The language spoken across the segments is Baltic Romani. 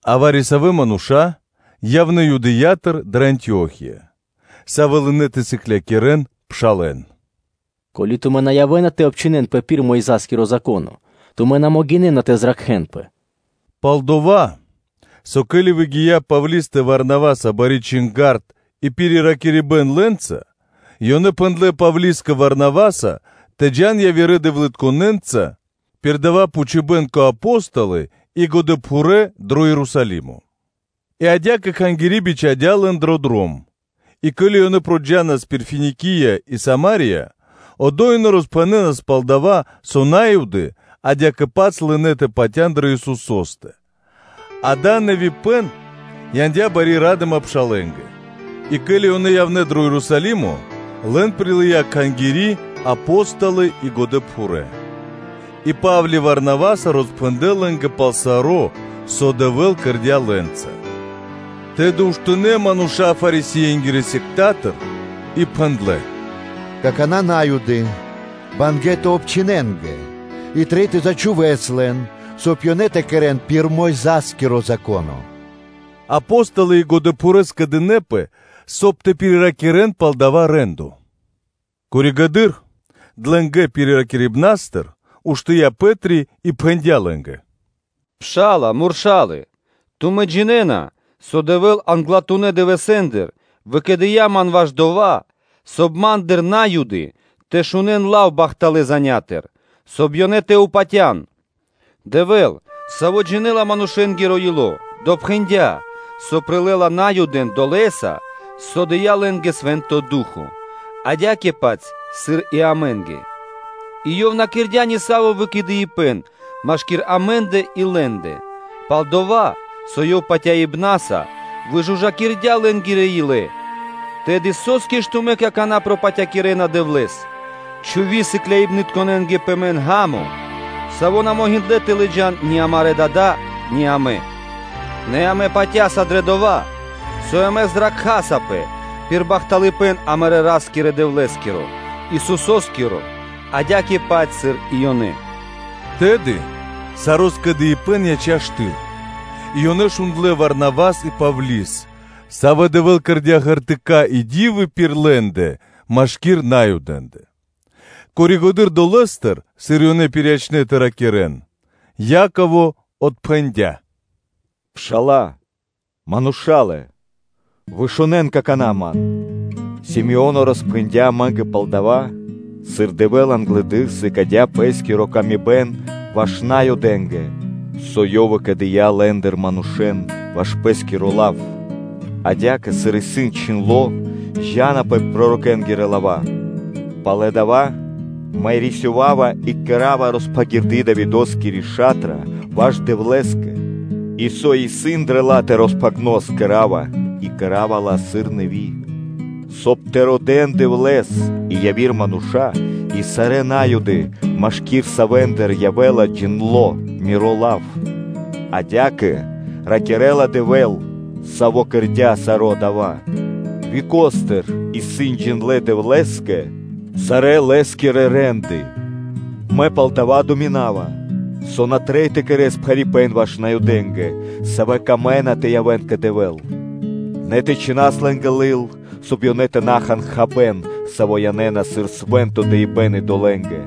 А вари-савэ́ мануша́ явнэ́ Юдэя́тыр дрэ Антио́хия, савэ́ лынэ́ тэ сыклякирэ́н пшалэ́н: “Ко́ли (со) тумэ́ на явэ́на тэ обчхинэнпэ пир Мойза́скиро Зако́но, тумэ́ на могинэ́на тэ зракхэнпэ.” Пал-дова́ со, ке́ли выгия́ Павлистэ Варнаваса бари чинга́рд и пириракирибэн лэ́нца, ёнэ пхэндлэ́ Павлискэ Варнаваса тэ джа́н явирэ дэвлытконэнца пир дава́ пхучибэн кэ Апо́столы и годэпхурэ́ (пхурэ́) дро Ерусалимо. И адя́кэ кхангири́ бичхадя́ лэн дрэ дром, и ке́ли ёнэ джа́нас пир Финикия и Сама́рия, одо́й ёнэ роспхэнэнас пал дава́, со На́юды адя́кэ-паць лынэ́ тэ патя́н дрэ Исусо́стэ, дава́ нэвипэн яндя́ бари ра́дыма пшалэ́нгэ. И ке́ли ёнэ явнэ́ дро Ерусалимо, лэн прилыя́ Кхангири, Апо́столы и годэпхурэ́, и Па́вли Варнаваса роспхэндлэ́ лэ́нгэ пал саро́, со Дэвэ́л кэрдя́ лэ́нца. Тэды уштынэ́ мануша́ Фарисее́нгирэ сектатыр и пхэндлэ́: “Какана́ Наюдэ́нгэ трэй тэ обчхинэнгэ и трэй тэ зачхувэс лэн, соб (кай) ёнэ тэ кэрэ́н пир Мойза́скиро Зако́но.” Апо́столы и годэпхурэ́ скэдынэ́пэ, соб (кай) тэ пириракирэн пал дава́ рэ́ндо. Пало́ (после) длэнго пириракирибэн уштыя́ Пэ́три и пхэндя́ лэ́нгэ: “Мануша́лэ-Пшала́лэ! Тумэ́ джинэ́на, со Дэвэ́л англатунэ́ дывэсэ́ндыр выкэдыя́ ман ваш дова́, соб (кай) ма́ндыр На́юды тэ шунэ́н лав бахталэ́ занятыр, соб (кай) ёнэ тэ патя́н. Дэвэ́л, Саво́ джинэ́ла манушэ́нгиро ило́, допхэндя, со прилэ́ла Наюдэн долэса, со дыя́ лэ́нгэ Свэ́нто Ду́хо (Фа́но) адя́кэ-паць, сыр и амэ́нгэ, и Ёв на кэрдя́ нисаво́ выкэдыибэн машки́р амэ́ндэ и лэ́ндэ, пал-дова́ со Ёв патяибна́са выжужакирдя́ лэ́нгирэ илэ. Тэды со́скэ ж тумэ́ какана́ пропатякирэна Дэвлэ́с, чхуви сыкляибнытконэ́нгэ пэ мэн ґа́мо, саво́ на могиндлэ́ тэ лыджа́н ни амарэ́ дада́, ни амэ? Нэ амэ патя́са дрэ дова́, со амэ зракхасапэ пир бахталыпэ́н амарэ́ Ра́скирэ-Дэвлэ́скиро, Исусо́скиро адя́кэ-паць, сыр и ёнэ.” Тэды саро́ скэдыибэ́н яця́ штыл и ёнэ шундлэ́ Варавас и Павли́с, савэ́ Дэвэ́л кэрдя́ ґертыка́ и ди́вы пир лэ́ндэ машки́р Наюдэ́нгэ. Пало́ (после) дова́, сыр ёнэ пириячнэ тэ ракирэ́н, Яково отпхэндя́: “Мануша́лэ-Пшала́лэ! Вышунэн какана́ ман: Си́моно роспхэндя́ амэ́нгэ пал дава́, сыр Дэвэ́л англэды́р сыкадя́ пэ́скири ла́ска ваш Наюдэ́нгэ, со Ёв выкэдыя́ лэ́ндыр манушэ́н ваш Пэ́скиро лав. Адя́кэ, сыр исын чхиндло́, зджанапэ пророкэ́нгирэ лава́: Пало́ дава́ Мэ рисёва́ва и кэра́ва роспхагирды Давидоскири ша́тра ваш Дэвлэ́скэ, и со исын дрэ ла́тэ роспхагно, мэ подкэрава, и кэра́ва ла, сыр нэви́, соб (кай) тэ родэ́н Дэвлэ́с и яви́р мануша́ и сарэ́ На́юды, машки́р савэ́ндыр явэ́ла джиндло́ Миро лав. Адя́кэ ракирэ́ла Дэвэ́л, саво́ кэрдя́ саро́ дава́. Векостыр исын джиндлэ́ Дэвлэ́скэ сарэ́ Лэ́скирэ рэ́нды. Мэ палдава́ думинава, со на трэй тэ кэрэ́с пхарипэ́н ваш Наюдэ́нгэ, савэ́ камэ́на тэ явэ́н кэ Дэвэ́л; нэ тэ чхинас лэ́нгэ лыл, соб (кай) ёнэ тэ на хан хабэ́н, саво́ янэ́на сыр свэ́нто дыибэ́н идолэ́нгэ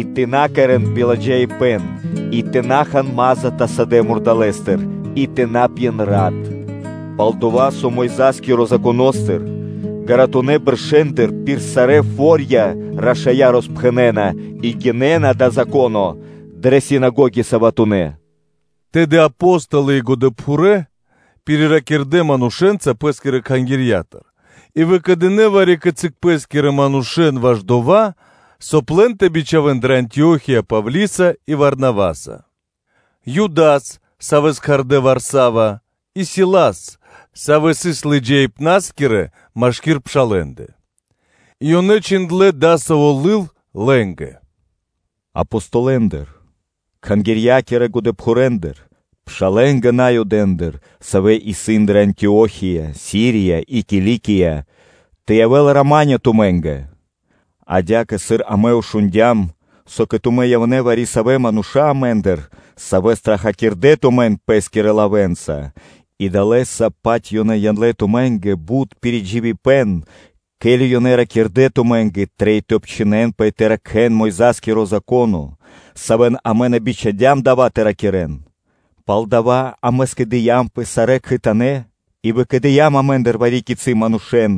и тэ на кэрэ́н биладжаипэ́н и тэ на хан мас затасадэ мурдалэстыр, и тэ на пьен рат. Пал-дова́ со Мойза́скиро Законо́стыр ґаратунэ́ бэршэ́ндыр пир сарэ́ фо́рья рашая́ роспхэнэна и гинэ́на дава́ Зако́но дрэ синагоги саватонэ́ (суботонэ́).” Тэды Апо́столы и годэпхурэ́ пириракирдэ манушэ́нца пэ́скирэ Кхангирья́тыр и выкэдынэ́ вари-кицы́ пэ́скирэ манушэ́н ваш дова́, соб (кай) лэн тэ бичхавэн дрэ Антио́хия Павлиса и Варнаваса: Юдас, савэ́с кхардэ́ о Варна́ва, и Силас, савэ́ сыс лыджаибна́скирэ (шэрэ́ мануша́) (вожди) машки́р пшалэ́ндэ, и ёнэ чхиндлэ́ дасаво лыл лэ́нгэ: “Апостолэндыр, кхангирья́кирэ годэпхурэндыр, пшалэ́нгэ Наюдэндыр, савэ́ исын дрэ Антио́хия, Сирия и Киликия: тэ явэ́л рама́нё (миро) тумэ́нгэ. Адя́кэ, сыр амэ шундя́м, со кэ тумэ́ явнэ́ вари-савэ́ мануша́ амэ́ндыр, савэ́ страхакирдэ тумэн пэ́скирэ лавэ́нца и далэ́са-паць ёнэ яндлэ́ тумэ́нгэ бут пиридживибэн, ке́ли ёнэ ракирдэ́: ‘Тумэ́нгэ трэй тэ обчхинэнпэ и тэ ракхэ́н Мойза́скиро Зако́но,’ савэ́н амэ на бичхадям дава́ тэ ракирэ́н; палдава́ амэ скэдыямпэ сарэ́ кхэтанэ́ и выкэдыям амэ́ндыр вари-кицы́ манушэ́н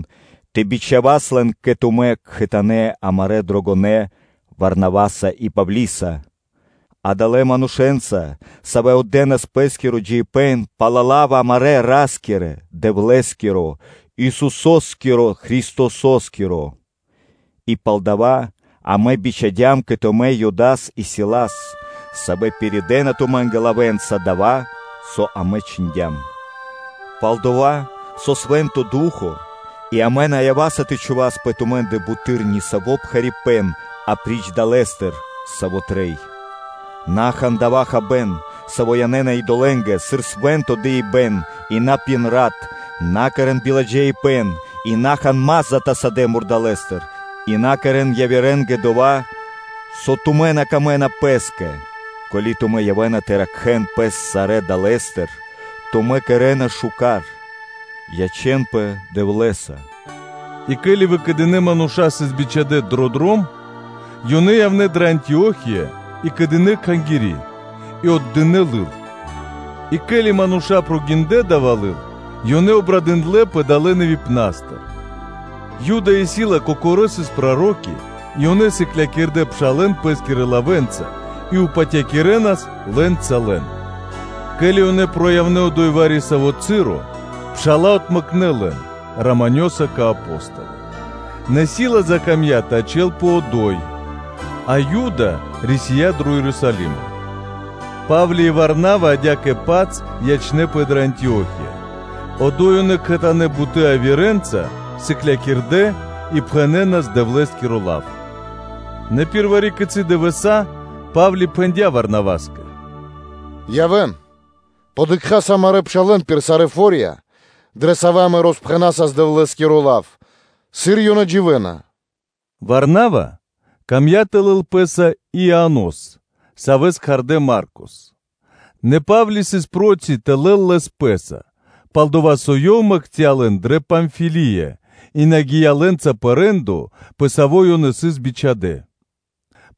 тэ бичхавас лэн кэ тумэ́ кхэтанэ́ амарэ́ дрогонэ́ Варнаваса и Павлиса, адалэ́ манушэ́нца, савэ́ отдэнас пэ́скиро джиибэ́н пал лав амарэ́ Ра́скирэ-Дэвлэ́скиро, Исусо́скиро Христосо́скиро. И палдава́ амэ бичхадям кэ тумэ́ Юдас и Силас, савэ́ пиридэна тумэ́нгэ лавэ́нца дова́, со амэ чхиндям. Пал-дова́ со Свэ́нто Ду́хо (Фа́но) и амэ на ява́са тэ чхувас пэ тумэ́ндэ буты́р нисаво́ пхарипэ́н апри́ч дава́, саво́ трэй. На хан дова́ хабэ́н, саво́ янэ́на идолэ́нгэ сыр свэ́нто дыибэ́н и на пьен рат, на кэрэ́н биладжаипэ́н, и на хан мас затасадэ мурдалэстыр, и на кэрэ́н явирэ́нгэ дова́, со тумэ́ на камэ́на пэ́скэ; ко́ли тумэ́ явэ́на тэ ракхэ́н пэс сарэ́ далэ́стыр, тумэ́ кэрэ́на шука́р. Ячэ́нпэ Дэвлэ́са.” И ке́ли выкэдынэ́ мануша́ сыс бичхадя́ дро дром, ёнэ явнэ́ дрэ Антио́хия, и скэдынэ́ кхангири́, и отдынэ́ лыл. И ке́ли мануша́ гиндлэ́ зоралэ́с дава́ лыл, ёнэ обрадындлэпэ далэ́ нэвипнастыр. Юда и Сила кокорэ́ сыс проро́ки и ёнэ сыклякирдэ́ пшалэ́н пэ́скирэ лавэ́нца и патякирэнас лэ́нца лэн. Ке́ли ёнэ сыс одо́й вари-саво́ часо, пша́ла отмэкнэ лэн раманёса (миро́са) кэ Апо́столы. Нэ Сила закамдя́ тэ ячэ́лпэ одо́й, а Юда рисия́ дро Ерусалимо: Па́вли и Варнава адя́кэ-паць ячнэ́пэ дрэ Антио́хия, одо́й ёнэ кхэтанэ́ бутэ́ явирэнца сыклякирдэ́ и пхэнэнас Дэвлэ́скиро лав. Нэ пир вари-кицы́ дывэса́ Па́вли пхэндя́ Варнаваскэ: “Явэ́н, дыкхаса амарэ́ пшалэ́н пир сарэ́ фо́рья, дрэ савэ́ амэ роспхэнасас Дэвлэ́скиро лав, сыр ёнэ дживэ́на.” Варнава камдя́ тэ лэл пэ́са и Ианос, савэ́с кхардэ́ Марко. Нэ Па́вли сыс проти тэ лэл лэс пэ́са, пал-дова́ со ёв мэкця́ лэн дрэ Памфилия и на гия́ лэ́нца пэ рэ́ндо, пэ саво́ ёнэ сыс бичхадэ́.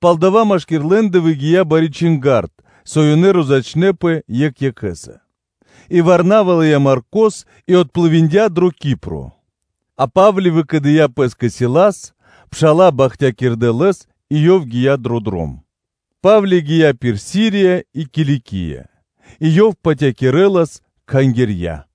Палдава́ машки́р лэ́ндэ выгия́ бари чинга́рд, со ёнэ розячнэпэ екх екхэ́са; и Варнава лыя́ Маркос и отплывиндя (дыя́ плима́ криг) дро Кипро; а Па́вли, выкэдыя́ пэ́скэ Силас, пша́ла бахтякирдэ лэс и ёв гия́ дрэ дром. Па́вли гия́ пир Сирия и Киликия и ёв патякирэлас кхангирья.